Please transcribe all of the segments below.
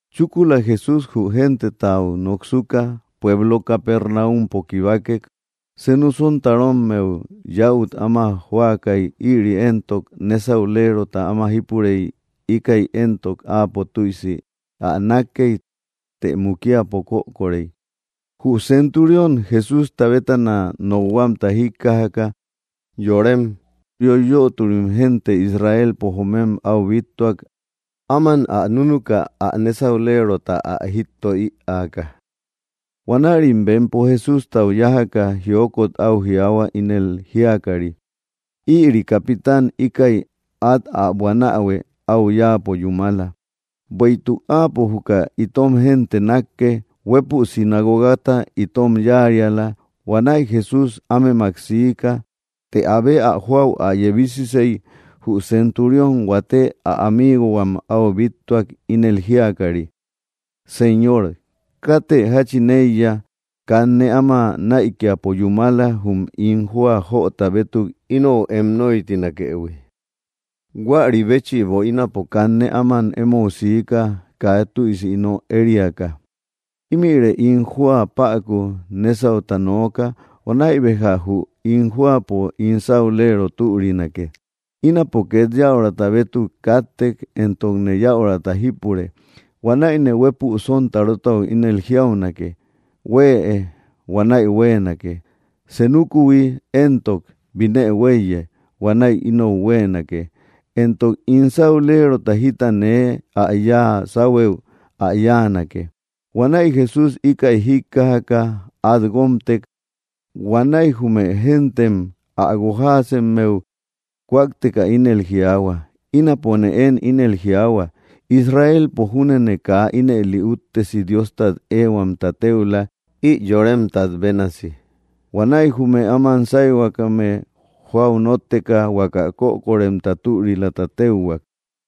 Chúkula Jesús jü gentetau noksuka, pueblo Capernaumpo kibakek. Senu sontarommeu yäut áma jóakay ïri éntok nésaulerota áma jípurey íkäi éntok áapo tüisi ä nákkey, të mukiapo kökorey. Jü centurión, Jesústa bétana nokhuamta jíkkajaka, yorem yoiyöturim gente Israelpo joomem áu bíttuak áman ä núnuka ä nésaulerota ä jítto ïaaka. Huanärim bempo Jesústau yájaka, jiokot áu jiaahua, ínel jíakari: —Ïri capitan íkäi át ä buanähuë áu yáapo yúmala, bueïtuk áapo juka itom génte nákke; huépü sinagogata itom yáariala. Huanäi Jesús ámemak siika. Të abe ä jóau ä yebisisey, jü centurión huate ä amiigohuam áu bíttuak, ínel jíakari: —Señor, kate jáchin éiya, kanne áma näikiapo yúmala jum ín jóa jöta bétuk inou em nóitinakëhui. Huäri béchïbo ínapo kanne áman émou siika kaa tüisi ino ériaka. Ímïre ín jóa päku nésauta nooka, huanäi béja jü ín jóapo ín sáulero türinake. Ínapo két yäurata bétuk káttek, éntokne yäurata jípure. Huanäine huépü sontarotau ínel jiaunake huëe, huanäi huéenake; senukuhui éntok binë huéiye, huanäi inou huéenake; éntok ín sáulerota jita nee ä yáa sáhuëu, ä yáanake. Huanäi Jesús, íkäi jíkkajaka át guómtek, huanäi jume géntem ä guojaasemmeu kúakteka ínel jiaahua: —Ínapone én ínel jiaahua, Israelpo júnene kaa ínëli úttesi Diostat ehuamta téula ï yoremtat bénasi. Huanäi jume áman sáyhuakäme jóau nótteka, huaka kökoremta türilata téuhuak.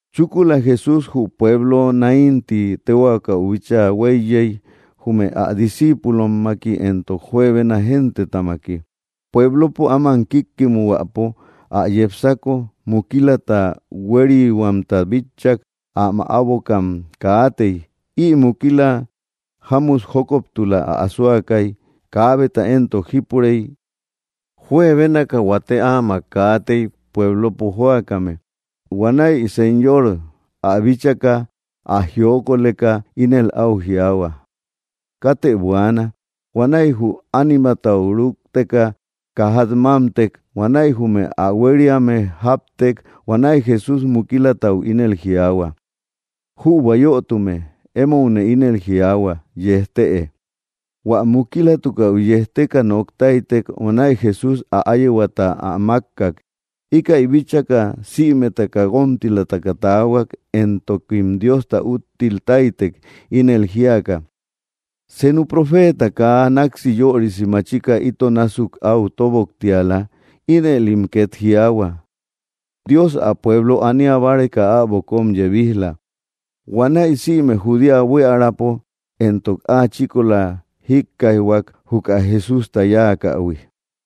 Chúkula Jesús jü pueblo Naín tí téhuakäu bíchaa huéiyey, jume ä discíipulommaki éntok juebena gentetamaki. Pueblopo áman kíkkimuhuäpo ä yepsako, mukilata hueriyhuamta bitchak, ä mäabokam kaatey, ï mukila jámut jókoptula ä asoakay kaabeta éntok jípurey. Juebénaka huate áamak kaatey pueblopo jóakame. Huanäi Señor ä bíchaka, ä jiokoleka, ínel áu jiaahua: —Katë buaana. Huanäi jü ánimatau rúkteka kajat mámtek; huanäi jume ä huériame jáptek. Huanäi Jesús mukilatau ínel jiaahua: —Jübua yötume, émoune ínel jiaahua: ¡Yejtëe! Huä mukilatukäu yejteka nok táytek, huanäi Jesús ä áyehuata ä mákkak. Íkäi bíchaka, sïmetaka guómtilataka taahuak, éntokim Diosta úttil táytek, ínel jíaka: —Senu profeeta kaa náksi yörisi machika ito násuk áu tóboktiala. Ínëlim ket jiaahua: —Dios ä pueblo ania báreka äbo kóm yebij‑la. Huanäi sïme Judea buiärapo éntok áa chíkola jíkkaijhuak juka Jesústa yáakähui.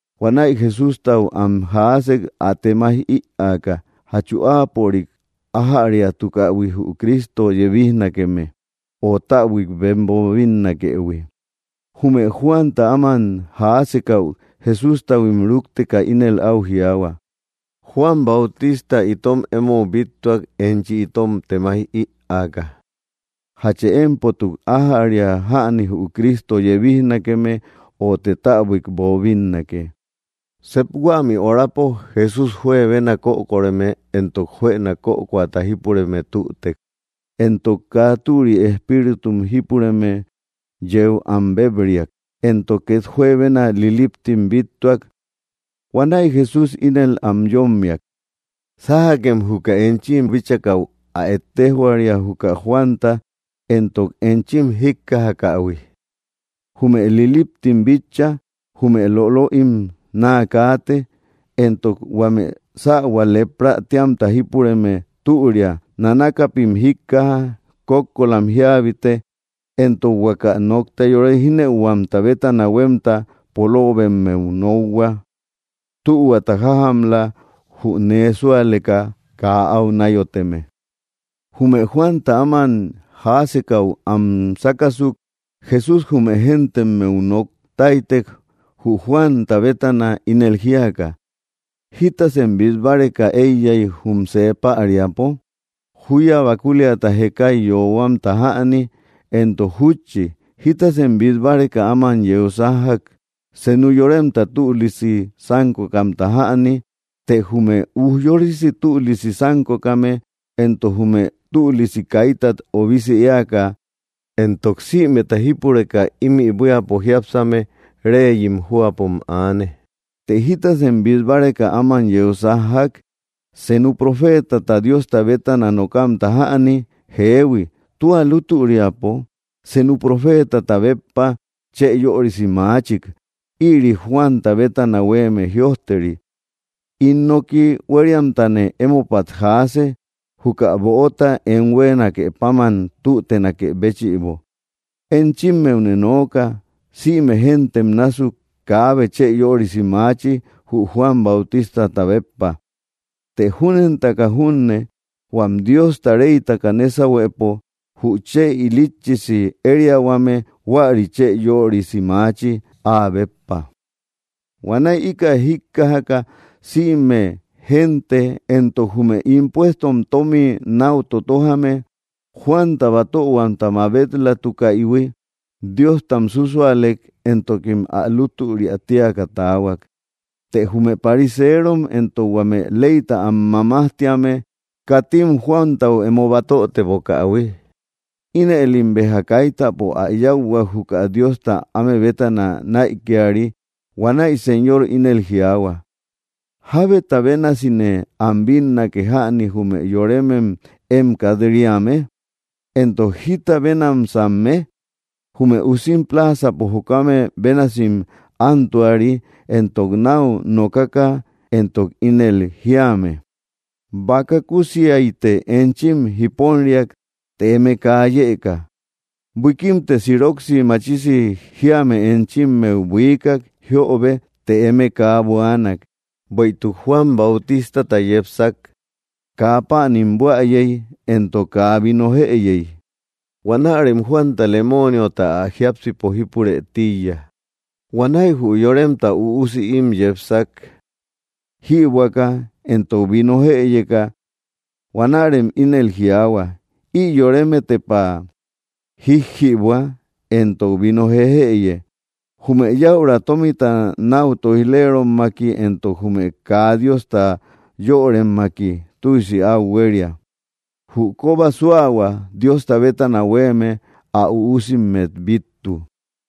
huanäi Jesústau am jaasek ä temaij ïaaka: ¿Jachu áapörik ájäriatukähui jü Cristo yebijnakeme, o täbuik bem boobinnakëhui? Jume Juanta áman jaasekäu, Jesústahuim rúkteka, ínel áu jiaahua: —Juan Bautista itom émou bíttuak enchi itom temaij ïaaka: ¿Jachë émpotuk ájäria jäni jü Cristo yebijnakeme, öte täbuik boobinnake? Sep huämï horapo, Jesús juebena kökoreme éntok juëna kökoata jípureme tütek, éntok kaa türi espíritum jípureme yeu am béb‑riak, éntok két juebena liliptim bíttuak. Huanäi Jesús ínel am yómmiak: —Sájakem juka enchim bíchakäu ä ejtejhuaria juka Juanta éntok enchim jíkkajakähui. Jume liliptim bitcha; jume lolöim naa kaate; éntok huame sähua lepra téamta jípureme türia, nanakapim jíkkaja, kókkolam jíabite, éntok huaka nokta yore jínëuhuamta bétana huémta poloobemmeu nokhua. Tühuata jájamla jü nee súaleka kaa áu náyoteme. Jume Juanta áman jaasekäu am sákasuk, Jesús jume géntemmeu nok táytek jü Juanta bétana, ínel jíaka: —¿Jítasem bít báreka éiyay jum see päriapo? ¿Júya bakuliata jekay yoohuamta jäni? Éntok jútchi, ¿jitasem bít báreka áman yeu sájjak? ¿Senu yoremta tülisi sánkokamta jäni? Të jume ujyorisi tülisi sánkokame, éntok jume tülisi kaitat obisi éaka, éntok sïmeta jípureka ímï buíapo jiápsame, reyim jóapom aane. Të, ¿jitasem bít báreka áman yeu sájjak? ¿Senu profeeta Diosta bétana nokamta jäni? Jeehui, tua lútüriapo senu profeetata béppa chë yörisi maachik. Ïri Juanta bétana huéeme jiöjteri: In noki huériamtane emopat jaase, juka böota em huéenake páman tütenakë béchïbo. Enchimmeune nooka sïme géntem násuk kaabe chë yörisi maachi jü Juan Bautistata béppa; të júnentaka junne, huam Diosta reytaka nésahuepo jü chë ilitchisi ériahuame huäri chë yörisi maachi áa béppa. Huanäi íkäi jíkkajaka, sïme gente éntok jume impuestom tómi náu totojame, Juanta batöhuamta mabet‑latukäihui, Diostam súsualek éntokim ä lútüria tíaka taahuak. Të jume pariseerom éntok huame leyta am mamajtíame, katim Juantau emo batötebokähui, inëlim béja kaitapo ä yáuhuak juka Diosta áme bétana näikiari. Huanäi Señor ínel jiaahua: —¿Jábeta bénasine am bínnake jäni, jume yoremem én kat‑riame? ¿Éntok, jita bénamsamme? Jume usim pláazapo jokame bénasim ántuari entok náu nokaka éntok ínel jíame: ‘‘Baka kusiaite enchim jiponriak të eme kaa yëkak. Buikimte siroksi machisi jíame enchimmeu buiikak jiöbe të eme kaa buaanak.” Bueïtuk Juan Bautistata yepsak, kaa páanim buäyey éntok kaa vino jëyey, huanärem Juanta lemooniota ä jiápsipo jípurë tíiya. Huanäi jü Yoremta Üusi ím yepsak, jïbuäka éntok vino jëyeka; huanärem ínel jiaahua, ï yoreme tepa jíjjïbuä éntok vino jejëye. Jume yäura tómita náu tóij‑lerommaki éntok jume kaa Diosta yöremmaki tüisi áu huéria. Jü kóba súahua Diosta bétana huéeme ä üusimmet bíttu.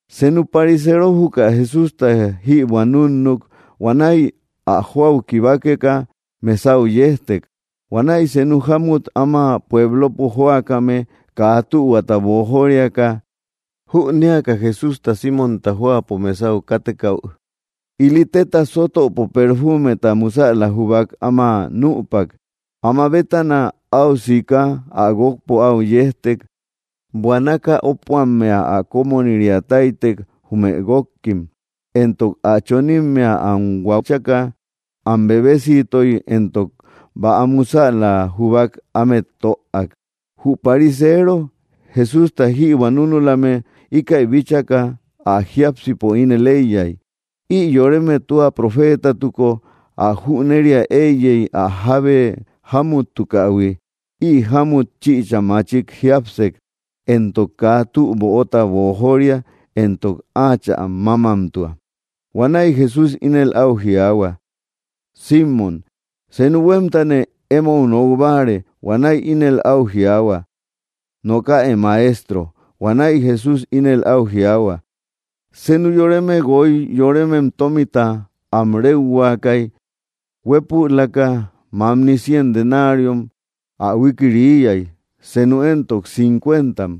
Senu parisero juka Jesústa jïbuä núnnuk, huanäi ä jóau kibakeka mesau yejtek. Huanäi senu jámut áma pueblopo jóakame kaa tühuata boojoriaka, jünéaka Jesústa Símonta jóapo mesau kátekäu, ili téta sótöpo perfumeta musäla jubak, áma nüpak. Áma bétana áu sika ä guókpo áu yejtek, buanaka ópuammea ä kómoniria táytek jume guókkim. Ëntok ä chonimmea am huaachaka, am bebesiitoy éntok bäa musäla jubak ámet töak. Jü parisero Jesústa jïbuä núnulame íkäi bíchaka, ä jiápsipo ínel éiyay: “Ï yoreme tua profeetatuko, ä jüneria éiyey ä jábe jámuttukähui, ï jámut chïcha machik jiápsek, éntok kaa tü böota boojoria, éntok áachä mámmatua.” Huanäi Jesús ínel áu jiaahua: —Símon, senu huémtane émou nok báare. Huanäi ínel áu jiaahua: —Nokäe, Maestro. Huanäi Jesús ínel áu jiaahua: —Senu yoreme guoy yoremem tómita am réuhuakäy. Huépülaka mamni cien denariom ä huikiriiyay, senu éntok cincuentam.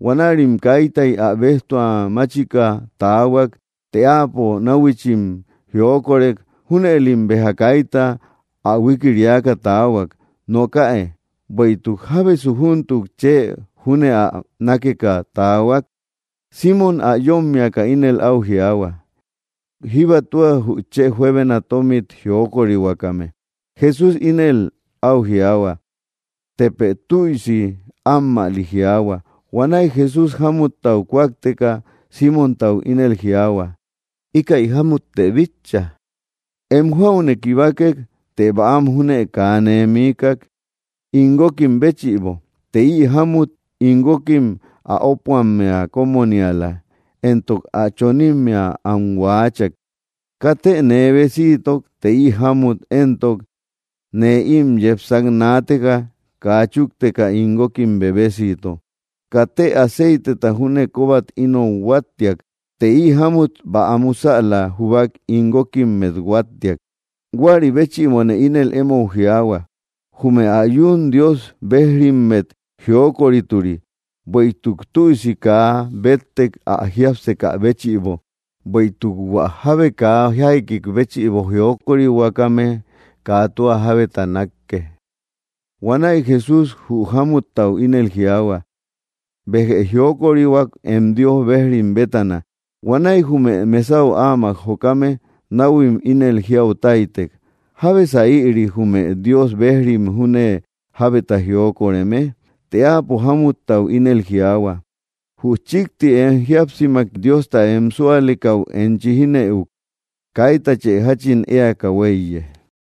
Huanärim kaitay ä béjtua máchika taahuak. Të áapo náhuichim jiokorek junëlim béja kaita ä huikiriaka taahuak. Nokäe, ¿bueïtuk jábesu júntuk chë júne ä nákeka taahuak? Símon ä yómmiaka ínel áu jiaahua: —Jíba tua jü chë juebena tómit jiokorihuakame. Jesús ínel áu jiaahua: —Tepë tüisi ammäli jiaahua. Huanäi Jesús, jámuttau kúakteka, Símontau ínel jiaahua: —¿Íkäi jámuttë bitcha? Em jóaune kibakek, të bäam júne kaa nee miikak ín guókim béchïbo; të ï jámut ín guókim ä ópuammea kómoniala, éntok ä chonimmea am huaachak. Katë nee besiitok, të ï jámut éntok, nee ím yepsak naateka, kaa chúkteka ín guókim bebesiito. Katë aceiteta júne kóbat inot huáttiak; të ï jámut bäa musäla jubak ín guókimmet huáttiak. Huäri béchïbone ínel émou jiaahua, jume ä yún Dios bejrimmet jiokorituri; bueïtuk tüisi kaa béttek ä jiápsekä béchïbo. Bueïtuk hua jábe kaa jaiki béchïbo jiokorihuakame, kaa tua jábeta nákke. Huanäi Jesús jü jámuttau ínel jiaahua: —Béjë jiokorihuak em Dios bejrim bétana. Huanäi jume mesau áamak jokame, náhuim ínel jiau táytek: —¿Jábesa ïri, jume Dios bejrim júne jábeta jiokoreme? Të áapo jámuttau ínel jiaahua: —Jü chíkti em jíapsimak Diosta em súalekäu enchi jínëuk. Kaitachë jáchin éaka huéiye.